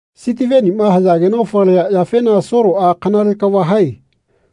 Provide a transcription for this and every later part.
Sitivenima hayageno falia yafena Soloꞌa “Kanale kava hae.”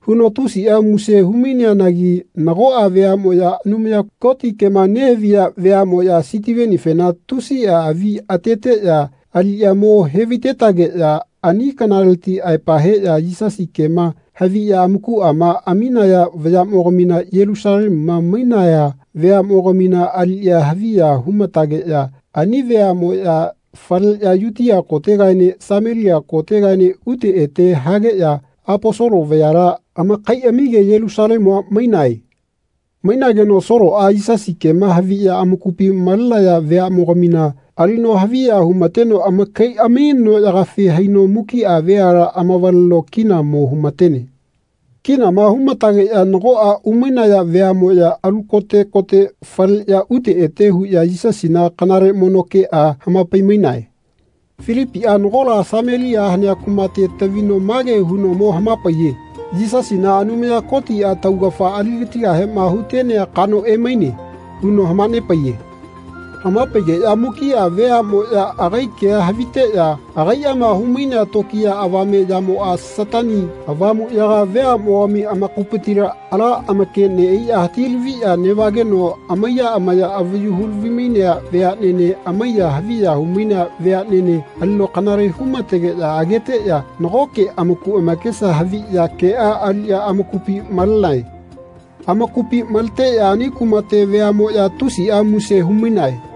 huno tusiꞌa muse humaineanagi nagoꞌa veaꞌmoꞌya Anumaya Koti kema nehaviya veaꞌmoꞌya Sitivenifena tusiꞌa avi ateteꞌya aliꞌya mo hevaitetageꞌya ani kanaleti aepa heꞌya Yisasi kema haviꞌya amakuꞌama aminaya vayaꞌmogamina Yelusalemuma nemaiya veaꞌmogamina aliꞌya haviya humatageꞌya ani veaꞌmoꞌya faleꞌya Yutia kotegaene Samelia kotegaene ute ete hageꞌya Aposolo vayala amakaiꞌamige Yelusalemua mainae. Mainageno Soloꞌa Yisasi kema haviꞌya amakupi malenaya veaꞌmogamina alino haviya humateno amakaiꞌami noꞌyagafi haino mukiꞌa veala amavaleno kina mo humatene. Kinama humatageꞌya nagoꞌa umainaya veaꞌmoꞌya alu kote kote faleꞌya ute ete huꞌya Yisasina kanale mono keꞌa hamapai-mainae. Filipiꞌa nagola Samelia hanea kumate tavino mage huno mo hamapaiye “Yisasina Anumaya Kotiꞌa taugafa aligatigahema hutenea kano emaine.” huno hamanepaiye. Hamapaigeꞌya mukiꞌa veaꞌmoꞌya agai kea haviteꞌya agaiꞌama humainea tokiya avame yamoꞌa Satani Avamuꞌyaga veaꞌmogami amakupitila ala amake neꞌaiꞌya hatilaviꞌya neꞌvageno amaiya amaya avayu hulavi-mainea veaꞌnene amaiya haviya humainea veaꞌnene alino kanale humategeꞌya ageteꞌya nagoke amaku amakesa haviꞌya keꞌa aliꞌya amakupi malenae. Amakupi maleteꞌya ani kumate veaꞌmoꞌya tusiꞌa muse humainae.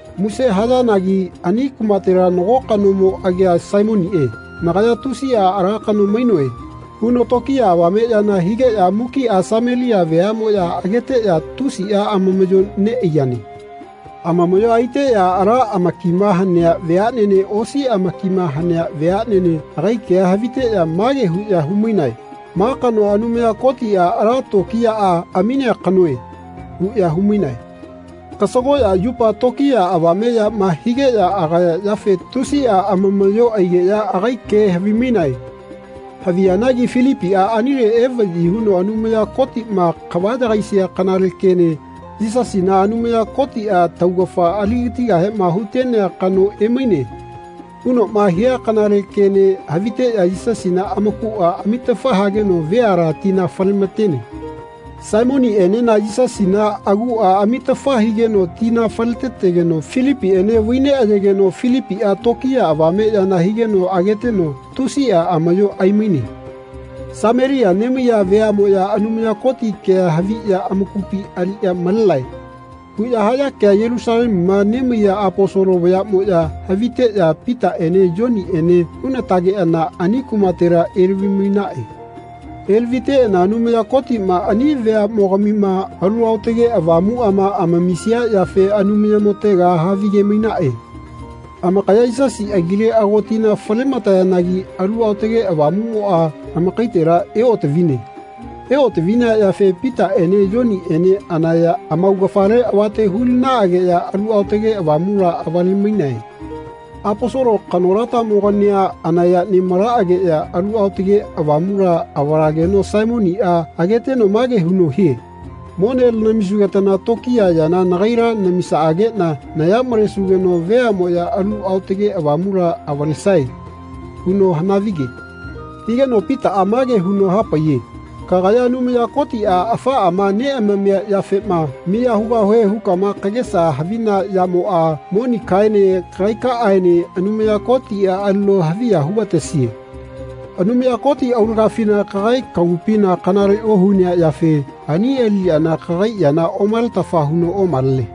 Muse hayanagi ani kumatela nago kanomo agia Saimoniꞌe “Nagaya tusiꞌa ala kano mainoe.” huno tokiya avame yana higeꞌya mukiꞌa Samelia veaꞌmoꞌya ageteꞌya tusiꞌa amamaꞌyo neꞌaiyane. Amamaꞌyoa aiteꞌya ala amakima hanea veaꞌnene osi amakima hanea veaꞌnene agai kea haviteꞌya mage huꞌya humainae “Ma kanoa Anumaya Kotiꞌa ala tokiyaꞌa aminea kanoe.” huꞌya humainae. Kasagoꞌya yupa tokiya avame yama higeꞌya agaya yafe tusiꞌa amamaꞌyo aigeꞌya agai ke havimainae. Haviyanagi Filipiꞌa anile evaꞌyi huno Anumaya Kotiꞌma kava yagaisia kanale kene “Yisasina Anumaya Kotiꞌa taugafa aligatigahema hutenea kano emaine.” hunoꞌma hia kanale kene haviteꞌya Yisasina amakuꞌa amitafa hageno veala tina falematene. Saimoniꞌenena Yisasina aguꞌa amitafa higeno tina faletetegeno Filipiꞌene vaineꞌayegeno Filipiꞌa tokiya avame yana higeno ageteno tusiꞌa amaꞌyo aimaine. “Samelia nemaiya veaꞌmoꞌya Anumaya Koti kea haviꞌya amakupi aliꞌya malenae.” huꞌya haya kea Yelusalemuma nemaiya Aposolo vayaꞌmoꞌya haviteꞌya Pitaꞌene Yoniꞌene hunatageꞌana ani kumatela elavi-mainaꞌe. Elaviteꞌana Anumaya Kotiꞌma ani veaꞌmogamima Alu Aotage Avamuꞌama amamisia yafe Anumayamotega havige-mainaꞌe. Amakaya Yisasi agile ago tina falematayanagi Alu Aotage Avamuꞌmoꞌa amakaitela eotavine. Eotavinea yafe Pitaꞌene Yoniꞌene anaya amaugafale avate hulinaꞌageꞌya Alu Aotage Avamula avale-mainae. Aposolo kanolatamogania anayama nemalaꞌageꞌya Alu Aotage Avamula avalageno Saimoniꞌa ageteno mage huno hie “Mone lanamisugetana tokiya yana nagaila namisaꞌageꞌna naya malesugeno veaꞌmoꞌya Alu Aotage Avamula avalesae.” huno hanavige. Higeno Pitaꞌa mage huno hapaiye “Kagaya Anumaya Kotiꞌa afaꞌama neꞌamamia yafema miya hugahue hukama kagesa havina yamoꞌa monikaꞌaene kagaikaꞌaene Anumaya Kotiꞌa alino haviya hugatesie. Anumaya Koti aulagafina kagai kagupina kanale ohunea yafe ani aliꞌyana kagai yana omaletafa huno omalene.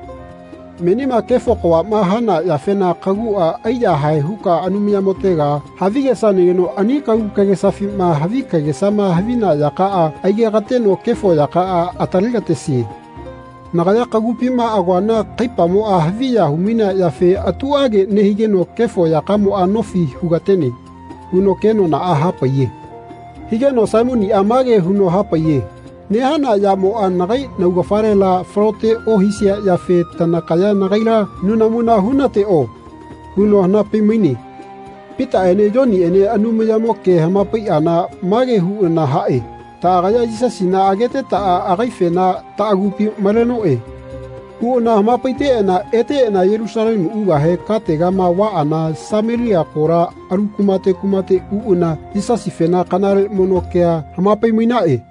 Menima kefo kavaꞌma hana yafena kaguꞌa aiyahae huka Anumayamotega havigesanageno ani kagu kagesafima havi kagesama havina yakaꞌa aigekateno kefo yakaꞌa atalegatesie. Nagaya kagupima agoana kaipamoꞌa haviya humainea yafe atuꞌage nehigeno kefo yakamoꞌa nofi hugatene.” huno kenonaꞌa hapaiye. Higeno Saimoniꞌa mage huno hapaiye “Nehana yamoꞌa nagai naugafalela falote ohisia yafe tanakaya nagaila nunamuna hunateꞌo.” huno hanapai-maine. Pitaꞌene Yoniꞌene Anumayamo ke hamapaiꞌana mage huꞌana haꞌe “Taꞌagaya Yisasina agetetaꞌa agaifena taꞌagupi malenoꞌe.” huꞌana hamapaiteꞌana eteꞌana Yelusalemu ugahe kategama vaꞌana Samelia kola alu kumate kumate uꞌana Yisasifena kanale mono keꞌa hamapai-mainaꞌe.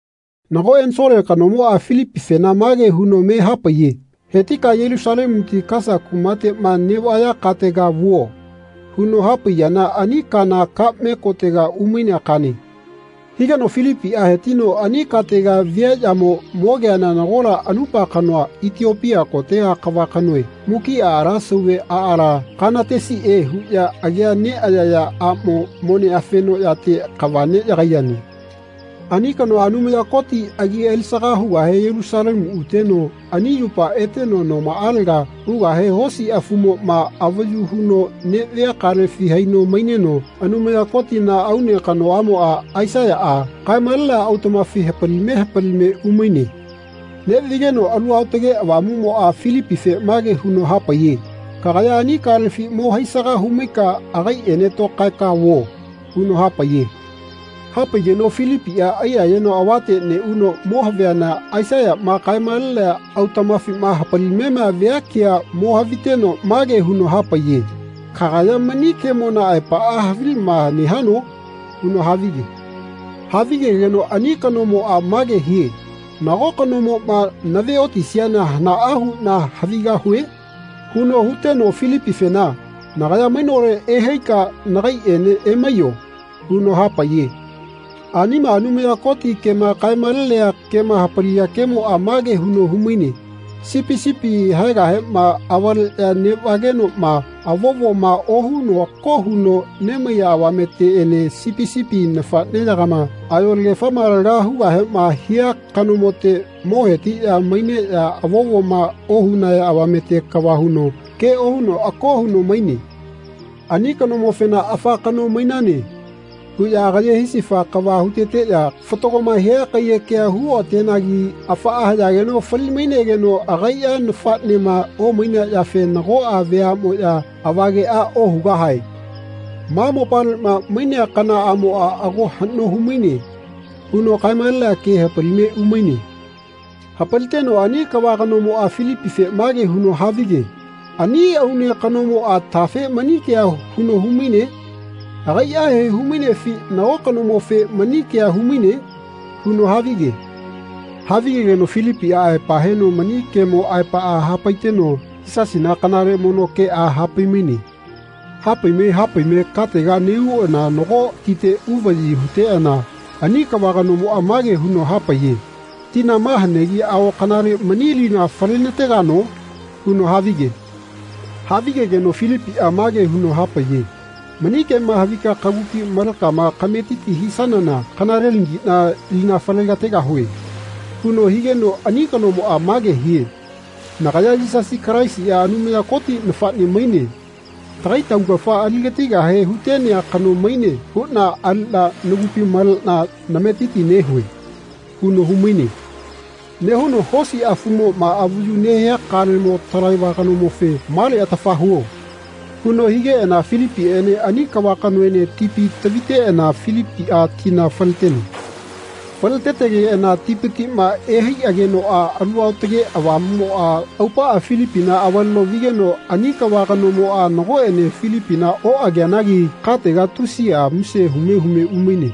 Nago ensole kanomoꞌa Filipifena mage huno me hapaiye “Hetika Yelusalemuti Kasa kumateꞌma neꞌvaya katega vuo.” huno hapaiyana ani kana kaꞌme kotega umainea kane. Higeno Filipiꞌa hetino ani katega viaꞌyamo mogeana nagola anupa kanoa Itiopia kotega kava kanoe mukiꞌa ala sauve aala, Kanatesiꞌe huꞌya agia neꞌayaya aꞌmo, mone afenoꞌyate kava neꞌyagaiyane. Ani kanoa Anumaya Koti agi alisaga hugahe Yelusalemu uteno ani yupa eteno nomaꞌalega ugahe hosi afumoꞌma avayu huno neꞌvia kalefi haino maineno Anumaya Kotina aune kanoꞌamoꞌa, Aisaiya, kae-malenea autaꞌmafi hapalime hapalime umaine. Neꞌvigeno Alu Aotage Avamuꞌmoꞌa Filipife mage huno hapaiye “Kagaya ani kalefi mo haisaga humaika agaiꞌene tokaeka vuo.” huno hapaiye. Hapaigeno Filipiꞌa aiyayeno avate neꞌuno mo haviana Aisaiyaꞌma kae-malenea autaꞌmafima hapalimema via kea mo haviteno mage huno hapaiye “Kagaya mani kemona aepaꞌa havilama nehano?” huno havige. Havigegeno ani kanomoꞌa mage hie “Nago kanomoꞌma naveotisiana hanaꞌa huꞌna havigahue?” huno huteno Filipifena “Nagaya mainole ehaika nagaiꞌene emaiyo.” huno hapaiye. Anima Anumaya Koti kema kae-malenea kema hapalia kemoꞌa mage huno humaine “Sipi sipi haegahema avaleꞌya neꞌvagenoꞌma avovoma ohuno ako huno nemaiya avameteꞌene sipi sipi nafaꞌneyagama ayolagefama laga hugahema hia kanomote mo hetiꞌya maineꞌya avovoma ohunaya avamete kava huno ke ohuno ako huno maine. Ani kanomofena ‘Afa kano mainane.’ huꞌya agaye hisifa kava huteteꞌya fatagoma hia kaiyekea huoꞌatenagi afaꞌa hayageno fali-mainegeno agaiꞌa nafaꞌnema omainea yafe nagoꞌa veaꞌmoꞌya avageꞌa ohugahae. Ma mopaleꞌma mainea kanaꞌamoꞌa ago haꞌno humaine.” huno kaemalenea ke hapalime umaine. Hapaliteno ani kava kanomoꞌa Filipife mage huno havige “Ani aune kanomoꞌa tafe mani kea huno humaine? Agaiꞌahe humainefi nago kanomofe mani kea humaine?” huno havige. Havigegeno Filipiꞌa aepa heno mani kemo aepaꞌa hapaiteno Yisasina kanale mono keꞌa hapaimaine. Hapaime hapaime katega neꞌuꞌana nago tite uvaꞌyi huteꞌana ani kava kanomoꞌa mage huno hapaiye “Tina ma hanegi ago kanale mani lina falenategano?” huno havige. Havigegeno Filipiꞌa mage huno hapaiye “Mani kema havika kagupi malekama kametiti hisanana kanalelagiꞌna lina falegategahue.” huno higeno ani kanomoꞌa mage hie “Nagaya Yisasi Kalaisiꞌa Anumaya Koti nafaꞌne maine. Tagai taugafa aligatigahe hutenea kano maine huꞌna aliꞌna nagupi maleꞌna nametiti nehue.” huno humaine. Nehuno hosi afumoꞌma avayu nehia kalemo talaiva kanomofe “Male atafa huo.” huno higeꞌana Filipiꞌene ani kava kanoene tipi taviteꞌana Filipiꞌa tina faletene. Faletetegeꞌana tipitiꞌma ehaiꞌagenoꞌa Alu Aotage Avamumoꞌa aupaꞌa Filipina avaleno vigeno ani kava kanomoꞌa nagoꞌene Filipina oꞌageanagi katega tusiꞌa muse hume hume umaine.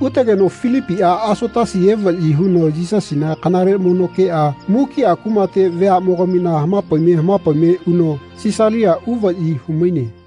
Utegeno Filipiꞌa Asotasi evaꞌyi huteno Yisasina kanale mono keꞌa mukiꞌa kumate veaꞌmogamina hamapaime hamapaime uno Sisalia uvaꞌyi humaine.